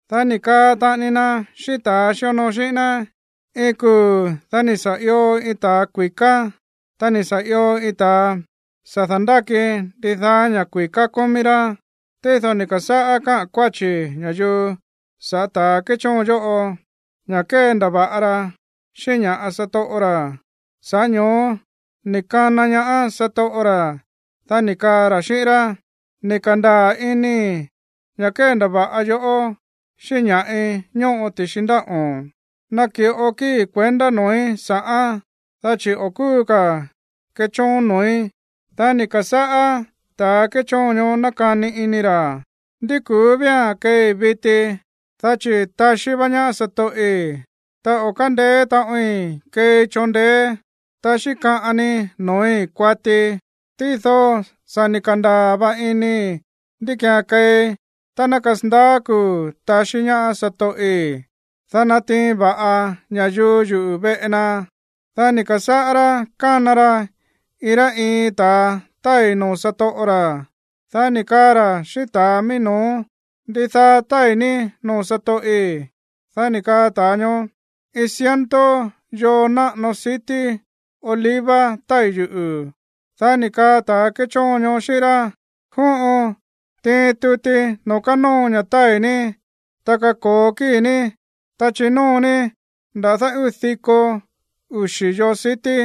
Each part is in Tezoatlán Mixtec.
Dá ni̱ kaa taꞌani na xíꞌín ta̱a xíonoo xíꞌín ná: ―Iin kuu̱ dá ni̱ sa̱ io iin ta̱ kui̱ká, ta ni̱ sa̱ io iin ta̱a sa̱ da̱ndáki ndidaá ña̱ kui̱ká kómí rá. Tído ni̱ ka̱sáꞌá káꞌa̱n kuáchi̱ ña̱yuu sa̱ꞌá ta̱ kéchóon yóꞌo, ña̱ kéndava̱ꞌa ra xíꞌín ña̱ꞌa satoꞌo ra̱. Sa̱ꞌá ño̱ó ni̱ kana ñaá satoꞌo ra̱, dá ni̱ kaa ra̱ xíꞌín rá: “Ni̱ ka̱ndaa̱ inii̱ ña̱ kéndava̱ꞌa yoꞌó xíꞌín ña̱ꞌi ñóꞌo ti̱xi ndáꞌo̱n. Naki̱ꞌo kíi̱ kuendá noo̱í sa̱ꞌán, dá chi̱ o̱ kúu ka̱ kechóon noo̱í.” Dá ni̱ ka̱sáꞌá ta̱ kéchóon ñoó nákani ini ra̱: “¿Ndí ku̱ú vía̱n keei viti, dá chi̱ táxí vá ñaá satoꞌi̱? Ta o̱ kándeé taꞌoin keei choon ndeé, ta xíkaꞌan ni noo̱í kuatii. Tído sa̱ ni̱ ka̱ndaa̱ va inii̱ ndí ki̱án keei tá ná kasandaá kuu̱ taxí ñaá satoꞌi̱, dá ná natiin va̱ꞌa ña̱yuu yuꞌu̱ veꞌe na.” ’Dá ni̱ ka̱sáꞌá rá kána ra iin rá iin ta̱a tái̱ noo̱ satoꞌo ra̱, dá ni̱ kaa ra̱ xíꞌín ta̱a mií no̱ó: “¿Ndidaa tái̱ ní noo̱ satoꞌi̱?” Dá ni̱ kaa ta̱a ñoó: “Iin ciento yoo náꞌano sití oliva tái̱ yuꞌu̱.” Dá ni̱ kaa ta̱ kéchóon ñoó xíꞌín rá: “Jóꞌon, tiin tuti noo̱ kánóo ña̱ tái̱ ní, ta kako̱o kíi̱ ní, ta chinóo ní nda̱dá uu̱ diko uxi̱ yoo sití.”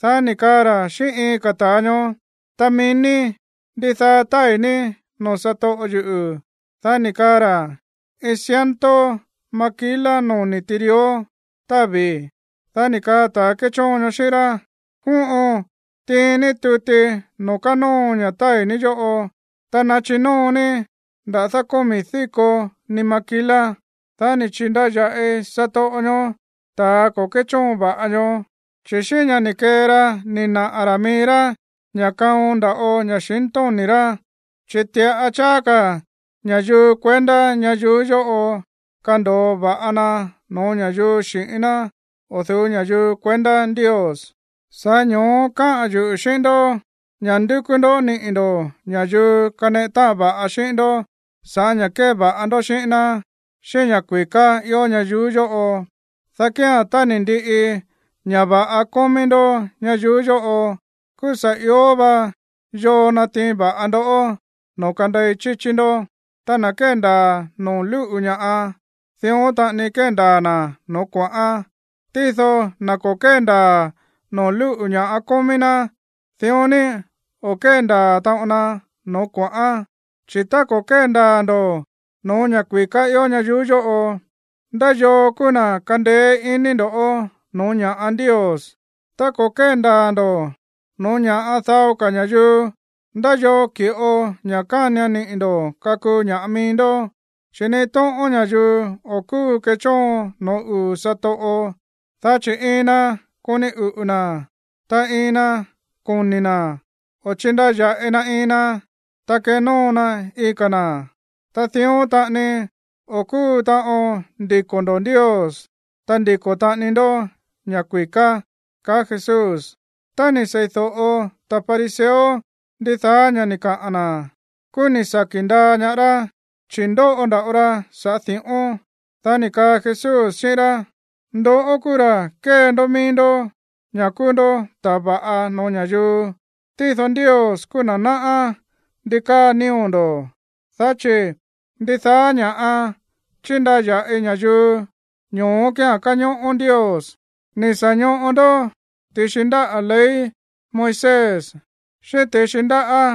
Dá ni̱ kaa ra̱ xíꞌín iin ka̱ ta̱a ñoó: “Ta mií ní, ¿ndidaa tái̱ ní noo̱ satoꞌo yuꞌu̱?” Dá ni̱ kaa ra̱: “Iin ciento maquila noni̱ tirió távi̱.” Dá ni̱ kaa ta̱ kéchóon ñoó xíꞌín rá: “Jóꞌon, tiin ní tuti noo̱ kánóo ña̱ tái̱ ní yóꞌo, ta nachinóo ní nda̱dá komi̱ díko ni maquila.” Dá ni̱ chi̱ndaya̱ꞌi satoꞌo ñoó ta̱ ko̱ kéchóon va̱ꞌa ñoó, chi̱ xíꞌín ña̱ ni̱ kee ra ni̱ naꞌa̱ ra̱ mií rá ña̱ kaon nda̱ꞌo ña̱xintóni̱ rá. Chi̱ ti̱ꞌa cháá ka̱ ña̱yuu kuendá ñayuú yóꞌo kando̱o va̱ꞌa na no̱ó ña̱yuu xi̱ꞌín ná o̱ du̱ú ña̱yuu kuendá Ndios. Sa̱ꞌá ño̱ó káꞌa̱n yuꞌu̱ xíꞌín ndoꞌó ña̱ ndukú ndó niꞌi̱ ndo̱ ña̱yuu kaneꞌe táꞌan va̱ꞌa xíꞌín ndó sa̱ꞌá ña̱ kéva̱ꞌa ndó xíꞌín ná xíꞌín ña̱ kui̱ká ió ñayuú yóꞌo, dá kía̱n tá ni̱ ndiꞌi ña̱ va̱ꞌa kómí ndó ñayuú yóꞌo, kúú sa̱ ió va yoo natiin va̱ꞌa ndoꞌó noo̱ kandei chíchí ndó. ’Ta na̱ kéndaa̱ noo̱ lúꞌu̱ ña̱ꞌa, dión taꞌani kéndaa̱ na̱ noo̱ kuaꞌán. Tído na̱ ko̱ kéndaa̱ noo̱ lúꞌu̱ ña̱ꞌa kómí ná, dión ni o̱ kéndaa̱ taꞌon na noo̱ kuaꞌán. Chi̱ tá ko̱ kéndaa̱ ndo̱ no̱ó ña̱ kui̱ká ió ñayuú yóꞌo, ¿ndá yoo kúú na̱ kandeé ini ndo̱ꞌó no̱ó ña̱ꞌa Ndios? Tá ko̱ kéndaa̱ ndo̱ no̱ó ña̱ꞌa dao ka̱ ña̱yuu, ¿ndá yoo ki̱ꞌo ña̱ kánian niꞌi̱ ndo̱ kakuu ña̱ꞌa mií ndó? Chi̱ ni iin tóꞌón ña̱yuu o̱ kúu kéchóon no̱ó uu̱ satoꞌo, dá chi̱ iin na koni uꞌu̱ na̱, ta iin na koni̱ na̱, o chindaya̱ꞌi na iin na, ta kenóo na iin ka̱ na̱. Ta dión taꞌani o̱ kúu taꞌon ndiko̱ ndo̱ Ndios, ta ndiko̱ taꞌani ndó ña̱ kui̱ká ―kaá Jesús. Tá ni̱ seídóꞌo ta̱ fariseo ndidaá ña̱ ni̱ kaꞌa̱n na̱, kúú ni̱ saki̱ ndaa ñaá rá, chi̱ ndóꞌo nda̱ꞌo ra sa̱ꞌá di̱ꞌón. Dá ni̱ kaa Jesús xíꞌín rá: ―Ndoꞌó kúú ra̱ kée ndó mií ndó ña̱ kúú ndó ta̱a va̱ꞌa no̱ó ña̱yuu, tído Ndios kúú na̱ náꞌá ndi káa nío̱ ndo̱, dá chi̱ ndidaá ña̱ꞌa chíndaya̱ꞌi ña̱yuu, ño̱ó kía̱n káñóꞌó Ndios. ’Ni̱ sa̱ ñoꞌo ndó ti̱xi ndáꞌa̱ ley Moisés, xíꞌín ti̱xi ndáꞌa̱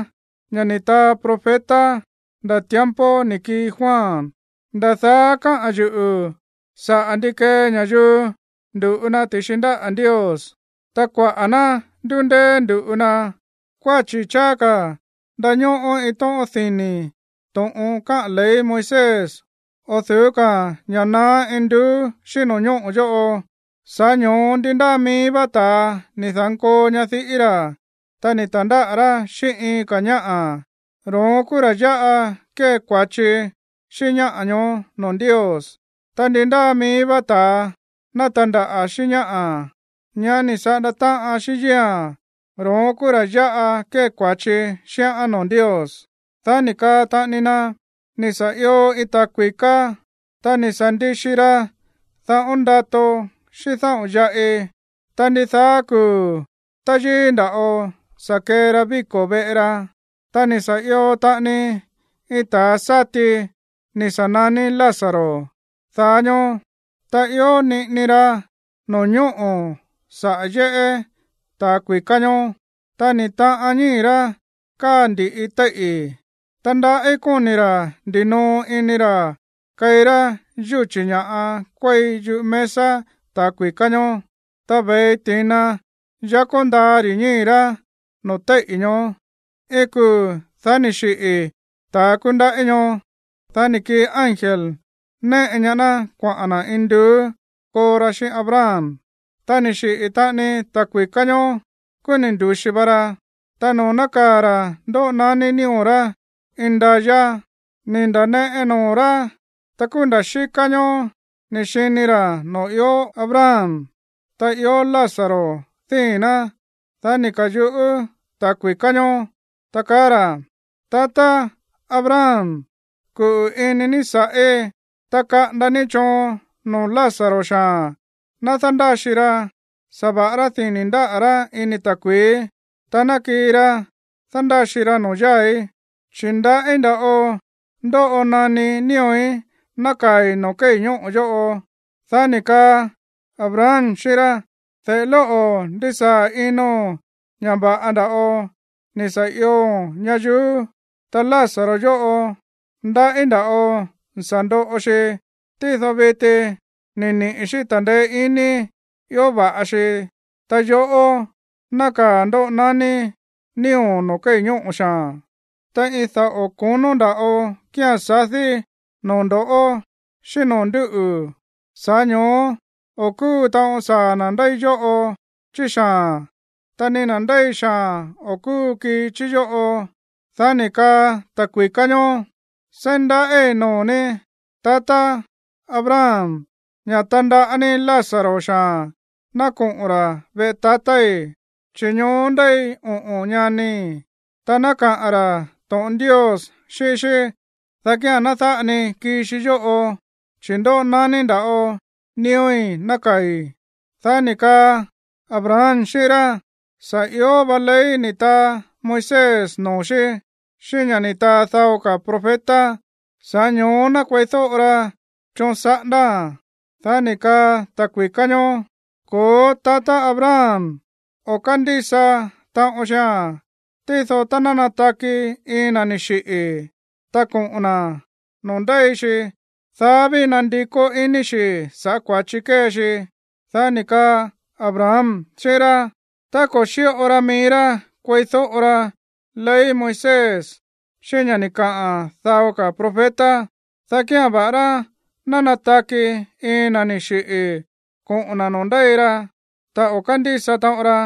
ña̱ ni̱ taa profeta nda̱ tiempo ni̱ kii Juan. Nda̱ daá káꞌa̱n yuꞌu̱ saꞌa̱ ndi kee ña̱yuu ndu̱ꞌu na ti̱xi ndáꞌa̱ Ndios. Ta kuaꞌa̱ ná ndúndéé ndu̱ꞌu na. Kuáchi̱ cháá ka̱ ndañóꞌó iin tóꞌón dini̱ to̱ꞌon káꞌa̱n ley Moisés, o̱ du̱ú ka̱ ña̱ naá induú xíꞌín no̱ñóꞌo̱ yóꞌo. ’Sa̱ꞌá ño̱ó ndi ndáa mií vá ta̱a ni̱ da̱nkoo ñadiꞌí ra̱, ta ni̱ ta̱ndáꞌa̱ rá xíꞌín iin ka̱ ñáꞌa̱, ro̱ón kúú ra̱ yáꞌa kée kua̱chi xíꞌín ñáꞌa̱ ñoó noo̱ Ndios. Ta ndi ndáa mií vá ta̱a ná tandaꞌa̱ xíꞌín ñáꞌa̱, ñá ni̱ saꞌanda táꞌan xíꞌín yíi̱a̱n, ro̱ón kúú ra̱ yáꞌa kée kua̱chi xíꞌán noo̱ Ndios. Dá ni̱ kaa taꞌani na: ―Ni̱ sa̱ io iin ta̱a kui̱ká. Ta ni̱ sa̱ ndixi ra dáꞌo̱n ndato xíꞌín dáꞌo̱n yaꞌi. Ta ndidaá kuu̱ táyíí nda̱ꞌo sa̱ kee ra víko̱ veꞌe ra. Ta ni̱ sa̱ io taꞌani iin ta̱a sa̱tí ni̱ sa̱ naní Lázaro daá ñóó, ta ió niꞌini ra no̱ñóꞌo̱ saꞌa̱ yéꞌé ta̱a kui̱ká ñoó. Ta ni̱ taꞌan ñíi̱ rá káa ndi̱ꞌi téíꞌi̱. Ta ndaꞌí kóni̱ ra̱ ndinoo ini ra̱ keí rá yúchi̱ ña̱ꞌa kuéi yúꞌu̱ mesa ta̱a kui̱ká ñoó. Ta ve̱i ti̱na yakó ndaa ri̱ ñíi̱ rá no̱ó téíꞌi̱ ñoó. ’Iin kuu̱, dá ni̱ xiꞌi̱ ta̱a kúndaꞌí ñoó. Dá ni̱ kii ángel néꞌe ñaá ná kuaꞌa̱n na̱ induú koo ra xíꞌín Abraham. Ta ni̱ xiꞌi̱ taꞌani ta̱ kui̱ká ñoó, kúú ni̱ ndu̱xi va ra. Ta noo̱ nákaa̱ ra̱ ndóꞌo naní nío̱ rá indayá, ni̱ nda̱neꞌe noo̱ rá. Ta kúú nda̱ xíká ñóó ni̱ xini ra̱ noo̱ ió Abraham, ta ió Lázaro díi̱n ná. Dá ni̱ ka̱yuꞌú ta̱ kui̱ká ñoó, ta kaá ra̱: “Tatá Abraham, kuꞌu̱ ini ní sa̱ꞌí, ta kaꞌanda ní choon noo̱ Lázaro xaa̱n ná dándáxi ra, sa̱ va̱ꞌará dini̱ ndáꞌa̱ rá ini ta̱kui̱í, ta ná kii ra dándáxi ra noo̱ yáa̱í, chi̱ ndaꞌí nda̱ꞌo ndóꞌo naní nío̱í nákaa̱i̱ noo̱ kéi̱ ñóꞌo̱ yóꞌo.” Dá ni̱ kaa Abraham xíꞌín rá: “De̱ꞌe lóꞌo̱, ndisaa̱ ino̱n ña̱ va̱ꞌa nda̱ꞌo ni̱ sa̱ ioo̱n ñayuú, ta Lázaro yóꞌo, ndaꞌí nda̱ꞌo ni̱ sa̱ ndoꞌo xi. Tído viti ni̱ niꞌi̱ xí ta̱ndeé iní ió va̱ꞌa xi. Ta yoꞌó, nákaa̱ ndóꞌo naní nío̱o̱n noo̱ kéi̱ ñóꞌo̱ xaa̱n. Ta iin daꞌo̱ konó nda̱ꞌo kía̱n sadí noo̱ ndo̱ꞌó xíꞌín noo̱ ndúꞌu̱. Sa̱ꞌá ño̱ó o̱ kúu taꞌon saa̱ na̱ ndéi yóꞌo chí xaa̱n, ta ni na̱ ndéi xaa̱n o̱ kúu kii chí yóꞌo.” Dá ni̱ kaa ta̱a kui̱ká ñoó: “Seí ndaꞌíi̱ noo̱ ní, tatá Abraham, ña̱ tandaꞌá ní Lázaro xaa̱n ná koꞌo̱n ra̱ veꞌe tatái̱, chi̱ ñoó ndéi oꞌo̱n ñanii̱, ta ná kaꞌa̱n ra̱ to̱ꞌon Ndios xíꞌín xí, dá kía̱n ná dáꞌa ni kii xi yóꞌo, chi̱ ndóꞌo naní nda̱ꞌo nío̱í nákaa̱i̱.” Dá ni̱ kaa Abraham xíꞌín rá: “Sa̱ ió va ley ni̱ taa Moisés noo̱ xí, xíꞌín ña̱ ni̱ taa dao ka̱ profeta. Sa̱ꞌá ño̱ó ná kueídóꞌo ra choon saꞌándáa̱n.” Dá ni̱ kaa ta̱ kui̱ká ñoó: “Ko̱ó, tatá Abraham, o̱ kándísa taꞌon xia̱n. Tído tá ná nataki iin na̱ ni̱ xiꞌi̱, ta koꞌo̱n na̱ noo̱ ndéi xi, dá ví nandikó iní xi̱ sa̱ꞌá kua̱chi kée xi.” Dá ni̱ kaa Abraham xíꞌín rá: “Tá ko̱ xíꞌo ra mií rá kueídóꞌo ra ley Moisés xíꞌín ña̱ ni̱ kaꞌa̱n dao ka̱ profeta, dá kía̱n, va̱ꞌará ná nataki iin na̱ ni̱ xiꞌi̱ koꞌo̱n na̱ noo̱ ndéi ra, ta o̱ kándísa taꞌon ra”,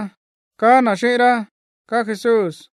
kaá na̱ xíꞌín rá ―kaá Jesús.